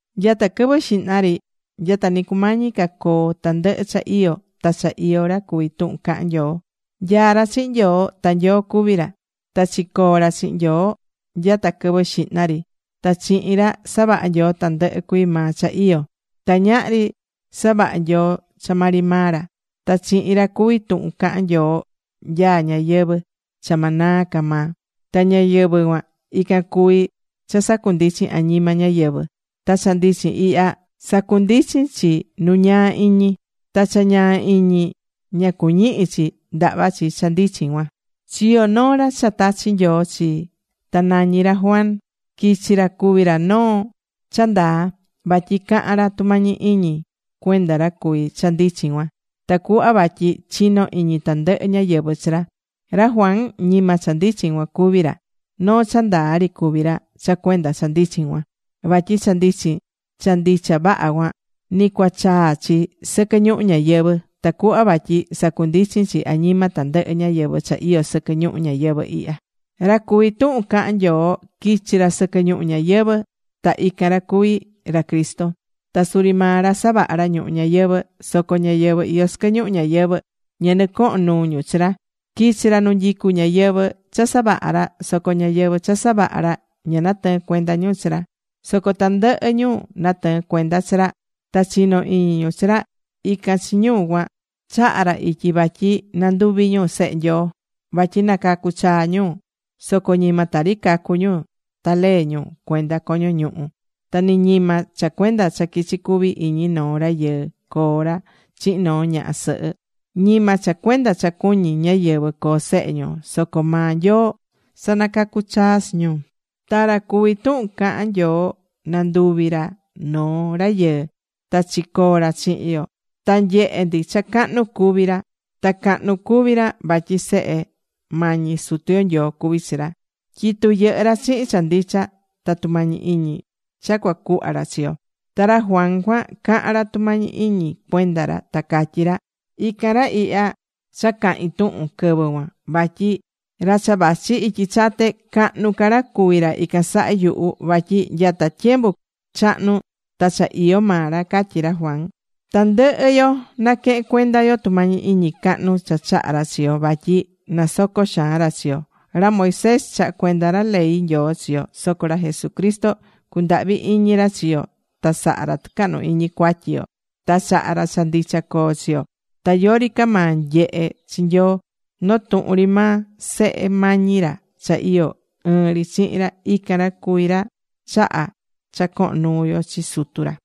Nyata quɨvɨ xihna ri, nyata ni cumañi ca coo tandɨhɨ cha iyó, ta cha iyó ra cuví Tuhun Cahán Nyoo. Nyaá ra chihin Nyoo. Ta Nyoo cuví ra. Ta chicoo̱ ra chihin Nyoo nyata quɨvɨ xihna ri. Ta chihin ra, savaha̱ Nyoo tandɨhɨ cuii maa cha iyó. Ta ñahri savaha̱ Nyoo cha maa ri maa ra. Ta chihin ra cuví Tuhun Cahán Nyoo nyaá ñayɨvɨ̱ cha ma naa ca maa. Ta ñayɨvɨ̱ cuan, ican cuví cha sacundichín añima ñáyɨvɨ. Ta cha ndichin ihya, sacundichín chi nu ñaa iñi. Ta cha ñaa iñi ña cuñihi̱ chi ndahva chi cha ndichin cuan. Chiyo̱ noo ra cha tachi̱ Nyoo chi. Ta nañí ra Juan. Quichi̱ ra cuvi̱ ra noo cha ndaa. Vatyi caha̱n ra tumañi iñi cuenda ra cuví cha ndichin cuan, tacuhva vatyi chino iñi tandɨhɨ ñáyɨvɨ chi ra. Ra Juan, ñima cha ndichin cuan cuví ra. Noo cha ndaa ri cuví ra cha cuenda cha ndichin cuan. Vatyi cha ndichin cha ndicha vaha cuan, nɨ cuachaa chi sɨquɨ ñuhu ñayɨvɨ̱, tacuhva vatyi sacundichín chi añima tandɨhɨ ñáyɨvɨ cha iyó sɨquɨ ñuhu ñayɨvɨ̱ ihya. Ra cuví Tuhun Cahán Nyoo quichi̱ ra sɨquɨ ñuhu ñayɨvɨ̱. Ta ican ra cuví ra Cristo. Ta suri maa ra savaha̱ ra ñuhu ñayɨvɨ̱. Soco ñáyɨvɨ iyó sɨquɨ ñuhu ñayɨvɨ̱, ña nɨcoho̱n nuu ñu chi ra. Quichi̱ ra nu nyicú ñáyɨvɨ cha savaha̱ ra, soco ñáyɨvɨ cha savaha ra ña natɨɨ̱n cuenda ñu chi ra. Soco tandɨhɨ ñu natɨɨ̱n cuenda chi ra, ta chinó iñi ñu chi ra, ican chi ñu cuan, chaha̱ ra ityi vatyi nanduvi ñu sehe Nyoo. Vatyi nacacu̱ chaa ñu. Soco ñima tari cacu̱ ñu ta lee ñu cuenda coño ñuhu ñu. Ta ni ñima cha cuenda cha quichi cuvi iñi noo rayɨɨ coo ra chihin noo ñaha sɨhɨ. Ñima cha cuenda cha cuñí ñáyɨvɨ coo sehe ñu. Soco maa Nyoo sanacacu̱ chaa chi ñu. Ta ra cuví Tuhun Cahán Nyoo nanduvi̱ ra noo rayɨɨ. Ta chicoo̱ ra chihin yo. Ta nyehe̱ ndi cha cahnu cuví ra. Ta cahnu cuví ra vatyi Sehe mañi Sutu yo Nyoo cuví chi ra. Tyitu yɨhɨ́ ra chihin cha ndicha ta tumañi iñi cha cua cuhva ra chi yo. Ta ra Juan cuan caha̱n ra tumañi iñi cuenda ra, ta catyí ra: ―Ican ra ihya cha cahi̱n tuhun quɨvɨ cuan, vatyi ra cha vachi ityi chate, cahnu ca ra cuví ra ican saha yuhu. Vatyi nyata tyembu chahnu ta cha iyó maa ra ―catyí ra Juan. Tandɨhɨ yo naquehén cuenda yo tumañi iñi cahnu cha chaha̱ ra chi yo, vatyi nasocó xaan ra chi yo. Ra Moisés chaha̱ cuenda ra ley Nyoo chi yo. Soco ra Jesucristo cundahvi̱ iñi ra chi yo ta saha̱ ra tɨcahnu iñi cuatyi yo. Ta chaha̱ ra cha ndicha coo chi yo. Ta yori ca maa nyehé chi Nyoo. Notuhun ri maa Sehe mañi ra cha iyó ɨɨn ri chihin ra. Ican ra cuví ra chahá cha cohon nuu yo chi Sutu ra.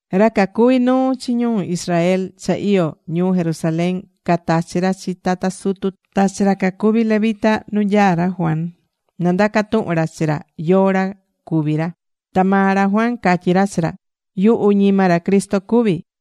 Ra cacuví nuu chi ñu Israel cha iyó ñuu Jerusalén, catachi̱ ra chi tata sutu ta chi ra cacuví levita nu nyaá ra Juan na ndaca tuhun ra chi ra yóó ra cuví ra. Ta maa ra Juan catyí cachi ra: ―Yuhu ñima ra Cristo cuví.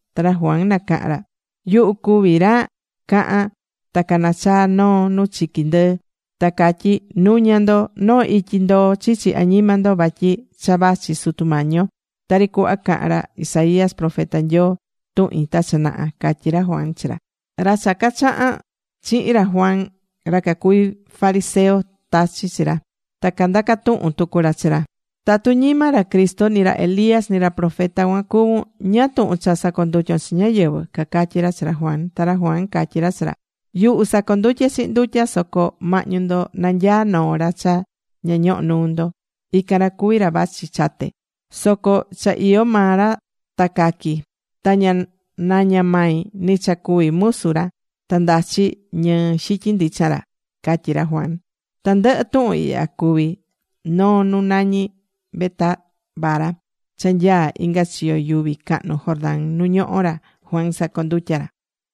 Ta ra Juan nacaha̱n ra: ―Yuhu cuví ra cahán ta canachaá noo nu chiqui ndɨɨ, ta catyí: “Nu̱ña ndo noo ityi ndoo chichi añima ndo vatyi cha vachi Sutu Mañi yo.” Tari cuhva caha̱n ra Isaías profeta Nyoo tuhin ta cha naha ―catyí ra Juan chi ra. Ra cha cacahán chihin ra Juan, ra cacuví fariseo tachi̱ chi ra. Ta candaca̱ tuhun tucu ra chi ra: ―Tatu ñima ra Cristo, ni ra Elías, ni ra profeta cuan cuvún, ¿ñáá tuhun cha sacondutyón chi ñáyɨvɨ? ―cacatyí ra chi ra Juan. Ta ra Juan catyí ra chi ra: ―Yuhu sacondutyé chihin ndutya. Soco mahñu ndo nanyaá noo ra cha ña ñohó nuu ndo. Ican ra cuví ra vachi chate. Soco cha iyó maa ra ta caqui. Ta ña naña mai ni cha cuví musu ra ta ndachi ñɨɨ xityin ndichan ra ―catyí ra Juan. Tandɨhɨ tuhun ihya cuvi̱ noo nu nañí Betábara cha nyaá inga chiyo yuvi cahnu Jordán nu ñohó ra Juan sacondutyá ra.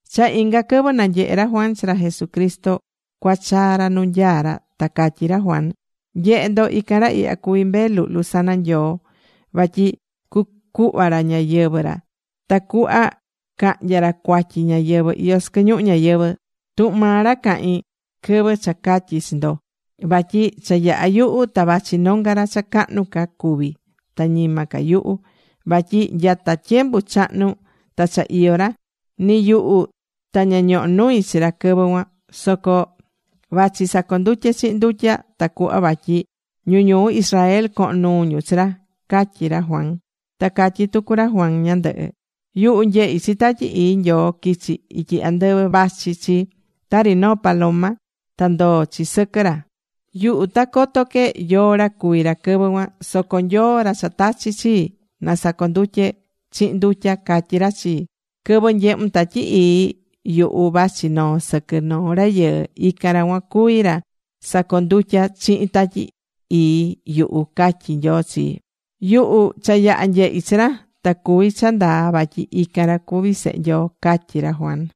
Cha inga quɨvɨ nanyehe̱ ra Juan chi ra Jesús cuachaa ra nu nyaá ra, ta catyí ra Juan: ―Nye̱he ndo, ican ra ihya cuví Mbee Luhlu sana Nyoo vatyi cucuhva ra ñayɨvɨ̱ ra tacuhva cahnya ra cuatyi ñáyɨvɨ iyó sɨquɨ ñuhu ñayɨvɨ̱. Tuhun maa ra cahi̱n quɨvɨ cha catyi̱ chi ndo vatyi cha yaha yuhu ta vachi nonga ra cha cahnu ca cuví ta ñima ca yuhu, vatyi nyata tyembu chahnu ta cha iyó ra. Ni yuhu ta ña ñoho̱ nui chi ra quɨvɨ cuan. Soco vachi sacondutyé chihin ndutya tacuhva vatyi ñu ñuu Israel cohon nuu ñu chi ra ―catyí ra Juan. Ta catyi̱ tucu ra Juan ñandɨhɨ: ―Yuhu nyehi̱ chi Tatyi Ii Nyoo quichi̱ ityi andɨvɨ vachi chi tari noo paloma, ta ndoo̱ chi sɨquɨ ra. Yuhu ta coto que yóó ra cuví ra quɨvɨ cuan. Soco Nyoo, ra cha tachi̱ chii na sacondutye chihin ndutya, catyi̱ ra chii: “Quɨvɨ nyehun Tatyi Ii yuhu, vachi noó sɨquɨ noo rayɨɨ, ican ra cuan cuví ra sacondutyá chihin Tatyi Ii yuhu”, catyí Nyoo chii. Yuhu cha yaha̱ nyehi̱ chi ra. Ta cuví cha ndaa vatyi ican ra cuví Sehe Nyoo ―catyí ra Juan.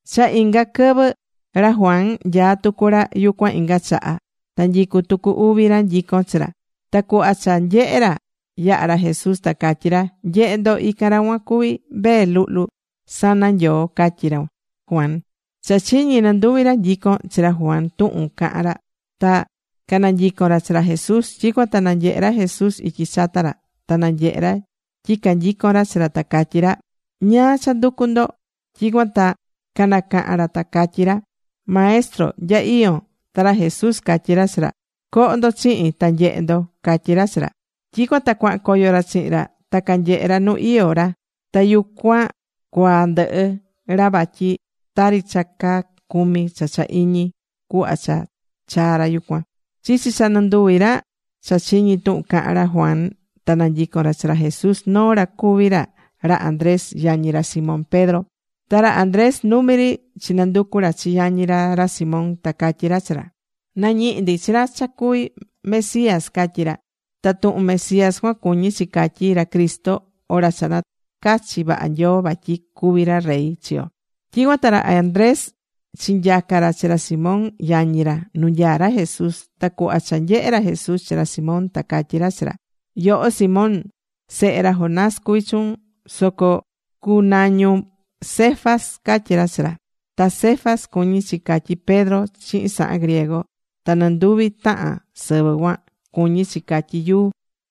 Cha inga quɨvɨ, ra Juan nyaá tucu ra yucuan inga chaha, ta nyicú tucu uvi ra nyicón chi ra. Ta cuhva cha nyehe̱ ra, yahá ra Jesús, ta catyí ra: ―Nye̱he ndo, ican ra cuan cuví Mbee Luhlu sana Nyoo ―catyí ra Juan. Cha chiñí nɨnduvi ra nyico̱n chi ra Juan tuhun caha̱n ra, ta cananyico̱n ra chi ra Jesús. Tyicuan ta nanyehe̱ ra Jesús ityi chata ra, ta nyehe̱ ra tyi canyicón ra chi ra, ta catyí ra: ―¿Ñáá cha nducú ndo? Tyicuan ta canacaha̱n ra ta catyí ra: ―Maestro, ¿nya iyón? Ta ra Jesús catyí ra chi ra: ―Co̱ho ndo chihin. ta nyehe ndo ―catyí ra chi ra. Tyicuan ta cuahan coyo ra chihin ra. Ta canyehe̱ ra nu iyó ra. Ta yucuan cuaa ndɨhɨ ra vatyi tari cha caa cumi cha cha iñi cuhva cha chaa̱ ra yucuan. Chichi cha nɨnduvi ra cha chiñi̱ tuhun caha̱n ra Juan ta nanyico̱n ra chi ra Jesús, noo ra cuví ra ra Andrés yañí ra Simón Pedro. Ta ra Andrés numi ri chinanducu̱ ra chi yañí ra, ra Simón, ta catyí ra chi ra: ―Nañihi̱ ndi chi ra cha cuví Mesías ―catyí ra. Ta tuhun Mesías cuan cuñí chi catyí, ra Cristo, o ra cha nacachi̱ vaha Nyoo, vatyi cuví ra rey chi yo. Tyicuan ta ra Andrés chinyaca̱ ra chi ra Simón yañi ra nu nyaá ra Jesús. Ta cuhva cha nyehe̱ ra Jesús chi ra Simón, ta catyí ra chi ra: ―Yoho Simón, sehe ra Jonás cuví chuun. Soco cunañun Cefas. ―catyí ra chi ra. Ta Cefas cuñí chi catyí Pedro chihin sahan griego, ta nɨnduvi tahan sɨvɨ cuan, cuñí chi catyí “yuu”.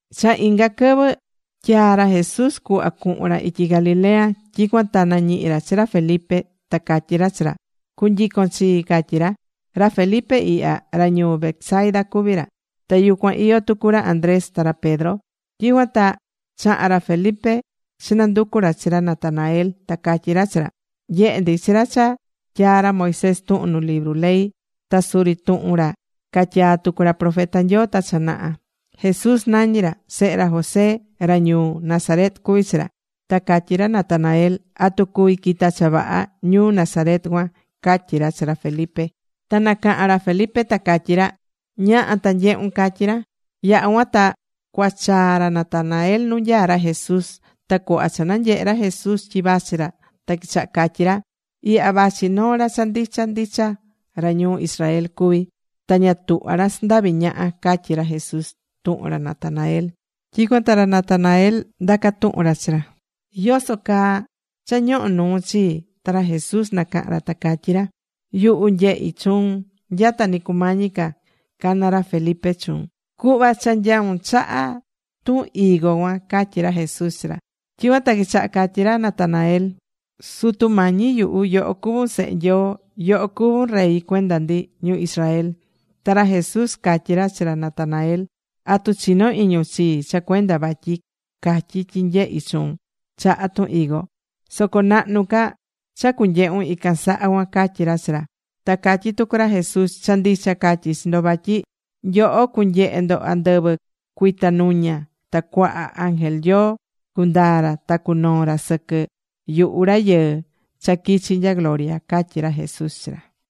Cha inga quɨvɨ tyaa̱ ra Jesús cuhva cuhun ra ityi Galilea. Tyicuan ta nañihi̱ ra chi ra Felipe. Ta catyí ra chi ra: ―Cu̱nyicon chii ―catyí ra. Ra Felipe ihya, ra ñuu Betsaida cuví ra. Ta yucuan iyó tucu ra Andrés ta ra Pedro. Tyicuan ta chaha̱n ra Felipe chinanducu̱ ra chi ra Natanael. Ta catyí ra chi ra: ―Nyehe̱ ndi chi ra cha tyaa̱ ra Moisés tuhun nu libru ley, ta suri tuhun ra catyaa̱ tucu ra profeta Nyoo ta cha naha. Jesús nañí ra. Sehe ra José ra ñuu Nazaret cuví chi ra. Ta catyi̱ ra Natanael: ―¿Atu cuvi quita cha vaha ñuu Nazaret cuan? ―catyí ra chi ra Felipe. Ta nacaha̱n ra Felipe ta catyí ra: ―Ña̱ha ta nye̱hun ―catyí ra. Yaha̱ cuan ta cuachaa ra Natanael nu nyaá ra Jesús. Ta cuhva cha nanyehe̱ ra Jesús tyi vachi ra, ta quichaha catyí ra: ―Ihya vachi noo ra cha ndicha ndicha ra ñuu Israel cuví. Ta ña tuhvá ra sandaví ñaha ―catyí ra Jesús tuhun ra Natanael. Tyicuan ta ra Natanael ndaca̱ tuhun ra chi ra: ―¿Yoso caa cha ñohó nuun chii? Ta ra Jesús nacaha̱n ra ta catyí ra: ―Yuhu nyehi̱ chuun nyata ni cumañi ca cana ra Felipe chuun, cuhva cha nyaún chaha tun higo cuan ―catyí ra Jesús chi ra. Tyicuan ta quichaha̱ catyí ra Natanael: ―Sutu Mañi yuhu, yoho cuvún Sehe Nyoo. Yoho cuvún rey cuenda ndi ñu Israel. Ta ra Jesús catyí ra chi ra Natanael: ―¿Atu chinó iñun chii cha cuenda vatyi catyí tyi nyehi̱ chuun chaha tun higo? Soco nahnu ca cha cunyehun ican saha cuan ―catyí ra chi ra. Ta catyí tucu ra Jesús: ―Cha ndicha catyí chi ndo vatyi nyoho cunyehe ndo andɨvɨ cuitanuña ta cuaha ángel Nyoo cundaa ra, ta cunoo ra sɨquɨ yuhu ra cuví Rayɨɨ cha quichi̱ nya gloria ―catyí ra Jesús chi ra.